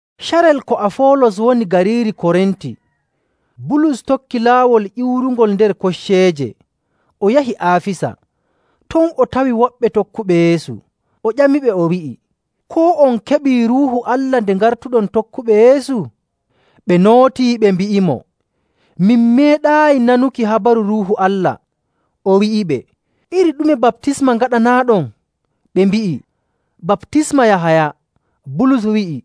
Carel ko Afoolos woni gariiri Korinti, Bulus tokki laawol ƴiwrungol nder kocceeje, o yahi Aafisa. Ton o tawi woɓɓe tokkuɓe Yeesu. O ƴamiɓe, o wi'i, “Koo on keɓii Ruuhu Allah nde ngartuɗon tokkuɓe Yeesu?” Ɓe nootii, ɓe mbi'imo, “Min meeɗaayi nanuki habaru Ruuhu Allah.” O wi'iɓe, “Iri ɗume baptisma ngaɗanaaɗon?” Ɓe mbi'i, “Baptisma Yahaya.” Bulus wi'i,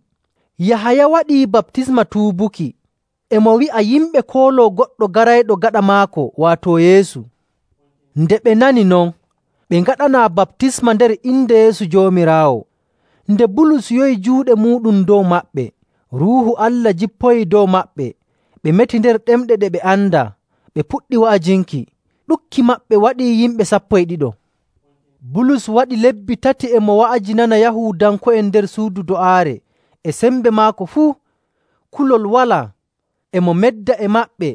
“Yahaya waɗii baptisma tuubuki. E mo wi'a yimɓe kooloo goɗɗo garayɗo gaɗa maako, waato Yeesu.”. Nde ɓe nani non, ɓe ngaɗanaa baptisma nder inde Yeesu Joomiraawo. Nde Bulus yowi juuɗe muuɗum dow maɓɓe, Ruuhu Allah jippoyii dow maɓɓe, ɓe meti nder ɗemɗe ɗe ɓe andaa, ɓe puɗɗi wa'ajinki. Ɗuɗki maɓɓe waɗii yimɓe sappo e ɗiɗo. Bulus waɗi lebbi tati e mo wa'ajinana Yahuudanko'en nder suudu do'aare e sembe maako fuu, kulol walaa. E mo medda e maɓɓe,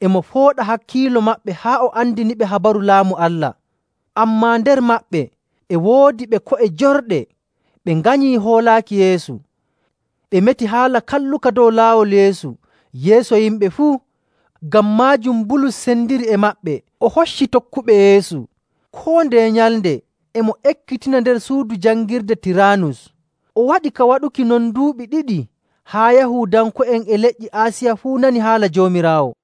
e mo fooɗa hakkiilo maɓɓe haa o andiniɓe habaru Laamu Allah. Ammaa nder maɓɓe e woodi ɓe ko'e jorɗe. Ɓe nganyi hoolaaki Yeesu, ɓe meti haala kalluka dow Laawol Yeesu yeeso yimɓe fuu. Ngam maajum Bulus sendiri e maɓɓe, o hocci tokkuɓe Yeesu. Koo ndeye nyalnde e mo ekkitina nder suudu jangirde Tiraanus. O waɗi ka waɗuki non duuɓi ɗiɗi haa Yahuudanko'en e leƴƴi Aasiya fuu nani haala Joomiraawo.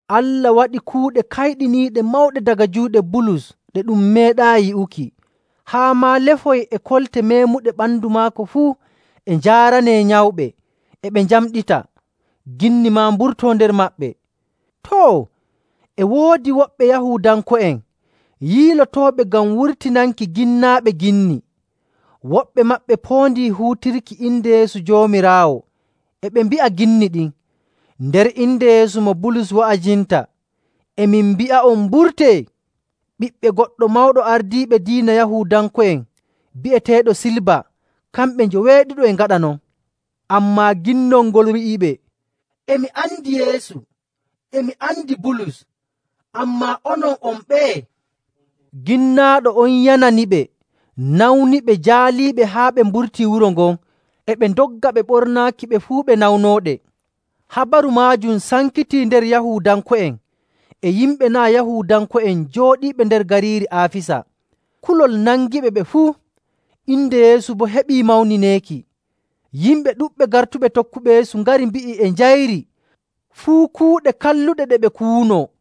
Allah waɗi kuuɗe kayɗiniiɗe mawɗe daga juuɗe Bulus ɗe ɗum meeɗaayi yi'uki. Haa maa lefoy e kolte meemuɗe ɓandu maako fuu e njaaranee nyawɓe, e ɓe njamɗita, ginni maa mburtoo nder maɓɓe. Too, e woodi woɓɓe Yahuudanko'en yiilotooɓe ngam wurtinanki ginnaaɓe ginni. Woɓɓe maɓɓe poondii huutirki inde Yeesu Joomiraawo, e ɓe mbi'a ginni ɗin, “Nder inde Yeesu mo Bulus wa'ajinta e min mbi'a'on mburtee!” Ɓiɓɓe goɗɗo mawɗo ardiiɓe diina Yahuudanko'en bi'eteeɗo Siiba kamɓe njoweeɗiɗo e ngaɗa non. Ammaa ginnol ngol wi'iɓe, “E mi andi Yeesu, e mi andi Bulus, ammaa onon, on ɓeye?” Ginnaaɗo on yananiɓe, nawniɓe, jaaliiɓe haa ɓe mburtii wuro ngon, e ɓe ndogga ɓe ɓornaaki ɓe fuu ɓe nawnooɗe. Habaru maajum sankitii nder Yahuudanko'en e yimɓe naa' Yahuudanko'en jooɗiiɓe nder gariiri Aafisa. Kulol nangiɓe, ɓe fuu. Inde Yeesu boo heɓii mawnineeki. Yimɓe ɗuɗɓe gartuɓe tokkuɓe Yeesu ngari mbi'i e njayri fuu kuuɗe kalluɗe ɗe ɓe kuwunoo.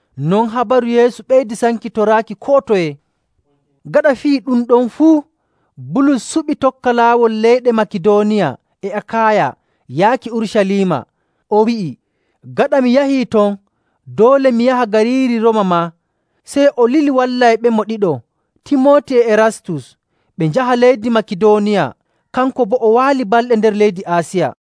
Non habaru Yeesu ɓeydi sankitoraaki koo toye. Gaɗa fii ɗum ɗon fuu, Bulus suɓi tokka laawol leyɗe Makidooniya e Akaaya yaaki Urucaliima. O wi'i, “Gaɗa mi yahii ton, doole mi yaha gariiri Rooma maa.” Sey o lili wallayɓemo ɗiɗo, Timooti e Erastus, ɓe njaha leydi Makidooniya. Kanko boo o waali balɗe nder leydi Aasiya.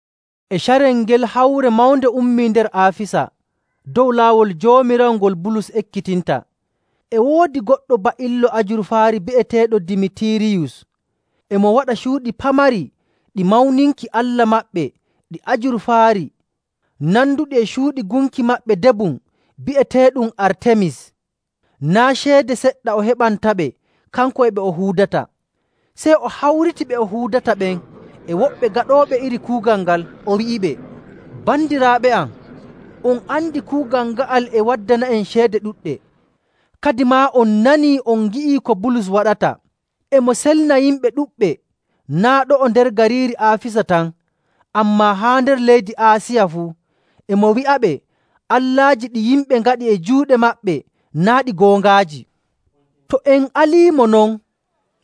E carel ngel hawre mawnde ummii nder Aafisa dow Laawol Joomiraawo ngol Bulus ekkitinta. E woodi goɗɗo ba'illo ajurfaari bi'eteeɗo Dimitiiriyus. E mo waɗa cuuɗi pamari ɗi mawninki allah maɓɓe ɗi ajurfaari nanduɗi e cuuɗi gunki: Waato labbi. maɓɓe debum bi'eteeɗum Artemis. Naa' ceede seɗɗa o heɓantaɓe, kanko e ɓe o huudata. Sey o hawriti ɓe o huudata ɓen e woɓɓe gaɗooɓe iri kuugal ngal, o wi'iɓe, “Bandiraaɓe am, on andi kuugal nga'al e waddana'en ceede ɗuɗɗe. Kadimaa on nanii, on ngi'ii ko Bulus waɗata. E mo selna yimɓe ɗuɗɓe, naa' ɗo'o nder gariiri Aafisa tan, ammaa haa nder leydi Aasiya fuu. E mo wi'aɓe allaaji ɗi yimɓe ngaɗi e juuɗe maɓɓe, naa' ɗi goongaaji. To en aldiimo non,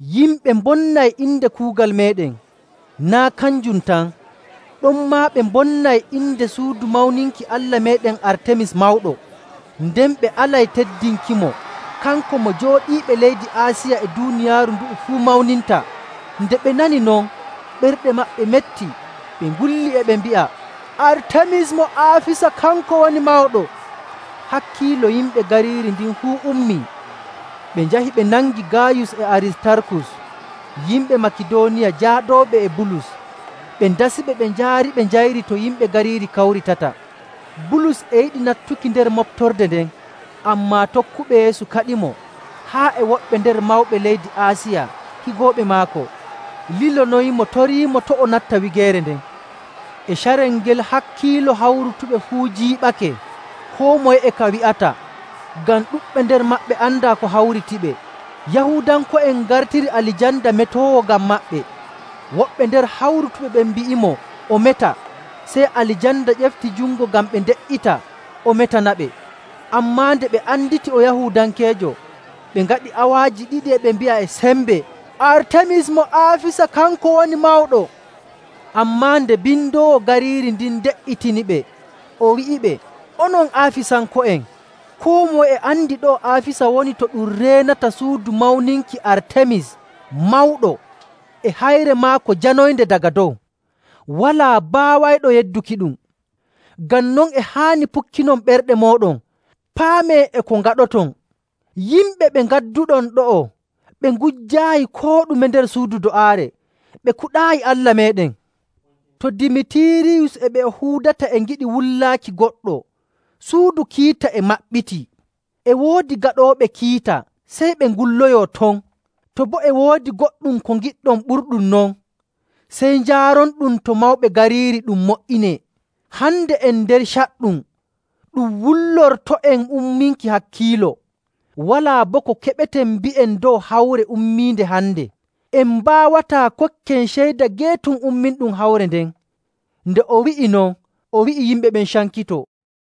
yimɓe mbonnay inde kuugal meeɗen. Naa' kanjum tan, ɗonmaa ɓe mbonnay inde suudu mawninki allah meeɗen Artemis mawɗo. Nden ɓe alay teddinkimo, kanko mo jooɗiiɓe leydi Aasiya e duuniyaaru ndu'u fuu mawninta.” Nde ɓe nani non, ɓerɗe maɓɓe metti, ɓe ngulli, e ɓe mbi'a, “Artemis mo Aafisa kanko woni mawɗo!” Hakkiilo yimɓe gariiri ndin fuu ummii, ɓe njahi ɓe nangi Gaayus e Aristarkus, yimɓe Makidooniya, jaadooɓe e Bulus. Ɓe ndasiɓe, ɓe njaariɓe njayri to yimɓe gariiri kawritata. Bulus e yiɗi nattuki nder moɓtorde nden, ammaa tokkuɓe Yeesu kaɗimo. Haa e woɓɓe nder mawɓe leydi Aasiya, higooɓe maako, lilonoyimo toriimo to' o natta wigeere nden. E carel ngel, hakkiilo hawrutuɓe fuu jiiɓake. Koo moye e ka wi'ata, ngam ɗuɗɓe nder maɓɓe andaa ko hawritiɓe. Yahuudanko'en ngartiri Alijanda metoowo ngam maɓɓe. Woɓɓe nder hawrutuɓe ɓen mbi'imo o meta. Sey Alijanda ƴefti jungo ngam ɓe nde''ita o metanaɓe. Ammaa nde ɓe anditi o Yahuudankeejo, ɓe ngaɗi awaaji ɗiɗi e ɓe mbi'a e sembe, “Artemis mo Aafisa kanko woni mawɗo!” Ammaa nde bindoowo gariiri ndin de''itiniɓe, o wi'iɓe, “Onon Aafisanko'en, koo moye e andi ɗo'o Aafisa woni to ɗum reenata suudu mawninki Artemis mawɗo e hayre maako janoynde daga dow. Walaa baawayɗo yeddukiɗum. Ngam non e haani pukkinon ɓerɗe mooɗon, paamee e ko ngaɗoton. Yimɓe ɓe ngadduɗon ɗo'o ɓe ngujjaayi koo ɗume nder suudu do'aare, ɓe kuɗaayi allah meeɗen. To Dimitiiriyus e ɓe o huudata e ngiɗi wullaaki goɗɗo, suudu kiita e maɓɓitii, e woodi gaɗooɓe kiita, sey ɓe ngulloyoo ton! To boo e woodi goɗɗum ko ngiɗɗon ɓurɗum non, sey njaaronɗum to mawɓe gariiri ɗum mo''inee. Hande en nder caɗɗum, ɗum wullorto'en umminki hakkiilo. Walaa boo ko keɓeten mbi'en dow hawre ummiinde hande. En mbaawataa kokken ceyda geetum umminɗum hawre nden.” Nde o wi'i non, o wi'i yimɓe ɓen cankitoo.